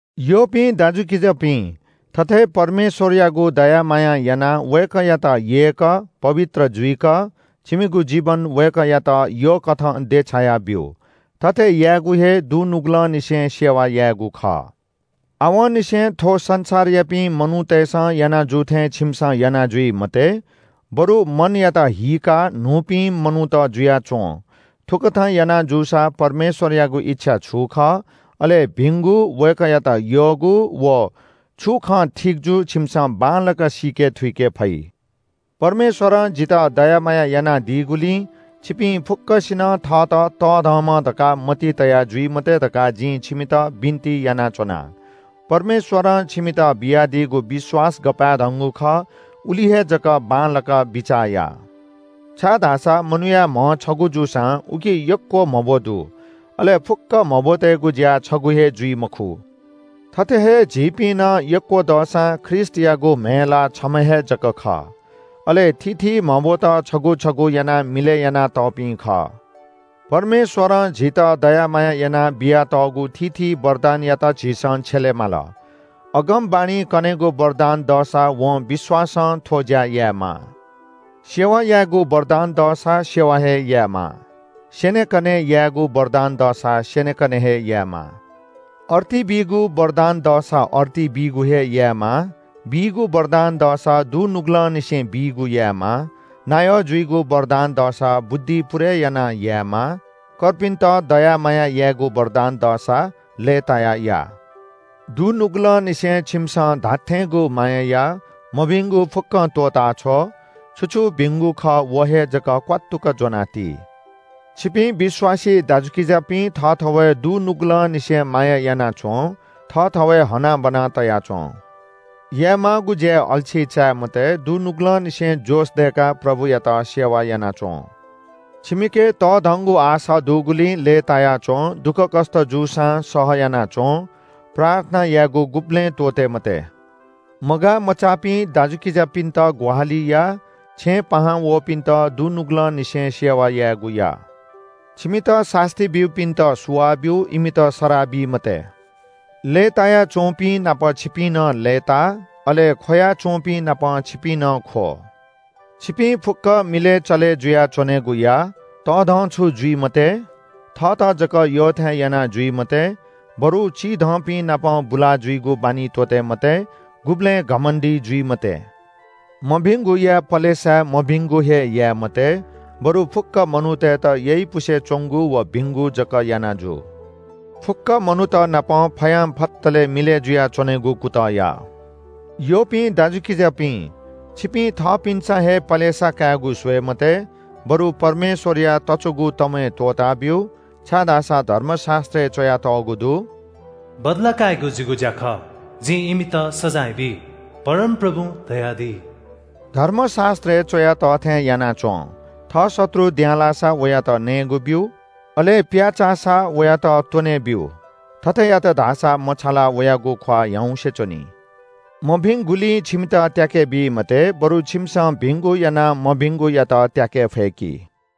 यःपिं दाजुकिजापिं, थथे परमेश्‍वरयागु दया मायां यानाः वय्‌कःयात यय्‌क, पवित्र जुइक, छिमिगु जीवन वय्‌कःयात बलिकथं देछाया ब्‍यु। थथे यायेगु हे दुनुगलंनिसें सेवा यायेगु खः। आवंनिसें थ्‍व संसारयापिं मनूतय्‌सं याना जू थें छिमिसं याना जुइ मते, बरु मनयात हीकाः न्‍हूपिं मनूत जुयाच्‍वँ। थुकथं याना जूसा परमेश्‍वरयागु इच्‍छा छु खः, अले भिंगु, वय्‌कःयात यःगु, व छु खँ ठीक जू छिमिसं बांलाक सीके थुइके फइ। परमेश्‍वरं जितः दया माया यानादीगुलिं छिपिं फुक्‍कसिनं थःत तःधंम्‍ह धकाः मतिइ तया जुइ मते धकाः जिं छिमित बिन्‍ति यानाच्‍वना। परमेश्‍वरं छिमित बियादीगु विश्‍वास गपाय्‌धंगु खः उलि हे जक बांलाक बिचाः या। छाय्‌धाःसा मनूया म्‍ह छगू जूसां उकी यक्‍व म्‍हब्‍व दु। अले फुक्‍क म्‍हब्‍वतय्‌गु ज्‍या छगू हे जुइ मखु। थथे हे झीपिं नं यक्‍व दसां ख्रीष्‍टयागु म्‍हय् ला छम्‍ह हे जक खः। अले थीथी म्‍हब्‍वत छगू छगू यानाः मिलय् यानातःपिं खः। परमेश्‍वरं झीत दया माया यानाः बियातःगु थीथी वरदानयात झीसं छ्यले माल। अगमवाणी कनेगु वरदान दःसा वं विश्‍वासं थ्‍व ज्‍या यायेमाः। सेवा याइगु वरदान दःसा सेवा हे यायेमाः। स्‍यनेकने यायेगु वरदान दःसा स्‍यनेकने हे यायेमाः। अर्ती बीगु वरदान दःसा अर्ती बीगु हे यायेमाः। बीगु वरदान दःसा दुनुगलंनिसें बीगु यायेमाः। नायः जुइगु वरदान दःसा बुद्धि पुरय् यानाः यायेमाः। कर्पिन्‍त दया माया यायेगु वरदान दःसा लय्‌तायाः या। दुनुगलंनिसें छिमिसं धात्‍थेंगु माया या। मभिंगु फुक्‍कं त्‍वःताछ्व। छु छु भिंगु खः व हे जक क्‍वात्तुक ज्‍वनाति। छिपिं विश्‍वासी दाजुकिजापिं थःथवय् दुनुगलंनिसें माया याना च्‍वँ। थःथवय् हनाबना तया च्‍वँ। यायेमाःगु ज्‍याय् अल्‍छी चाये मते। दुनुगलंनिसें जोश दय्‌काः प्रभुयात सेवा याना च्‍वँ। छिमिके तःधंगु आशा दुगुलिं लय्‌ताया च्‍वँ। दुःखकष्‍ट जूसां सहयाना च्‍वँ। प्रार्थना यायेगु गुबलें त्‍वःते मते। मगाःमचाःपिं दाजुकिजापिन्‍त ग्‍वाहालि या। छेँय् पाहां वःपिन्‍त दुनुगलंनिसें सेवा यायेगु या। छिमित सास्‍ती ब्‍यूपिन्‍त सुवाः ब्‍यु, इमित सराः बी मते। लय्‌ताय्‌त च्‍वंपिं नाप छिपिं नं लय्‌ता। अले ख्‍वया च्‍वंपिं नाप छिपिं नं ख्‍व। छिपिं फुक्‍कं मिलय् चले जुयाः च्‍वनेगु या। तःधंछु जुइ मते, थःत जक यःथें याना जुइ मते, बरु चिधंपिं नाप बुला जुइगु बानी त्‍वःते मते। गुबलें घमण्‍डी जुइ मते। मभिंगुया पलेसा मभिंगु हे याये मते, बरु फुक्‍क मनूतय्‌त यइपुसे च्‍वंगु व भिंगु जक याना जु। फुक्‍क मनूत नाप फयां फतलय् मिलय् जुयाच्‍वनेगु कुतः या। यःपिं दाजुकिजापिं, छिपिं थःपिन्‍सं हे पलेसा कायेगु स्‍वये मते, बरु परमेश्‍वरया तच्‍वःगु तंमय्‌ त्‍वःताब्‍यु। छाय्‌धाःसा धर्मशास्‍त्रय् च्‍वयातःगु दु, “बदला कायेगु जिगु ज्‍या खः, जिं इमित सजाँय बी” परमप्रभुं धयादी। धर्मशास्‍त्रय् च्‍वया तः थें याना च्‍वँ – “थः शत्रु द्यांलाःसा वयात नयेगु ब्‍यु, अले पित्‍याःसा वयात त्‍वने ब्‍यु। थथे यात धाःसा मछालाः वयागु ख्‍वाः ह्याउँसे च्‍वनी।” मभिंगुलिं छिमित त्‍याके बी मते, बरु छिमिसं भिंगु यानाः मभिंगुयात त्‍याके फय्‌कि।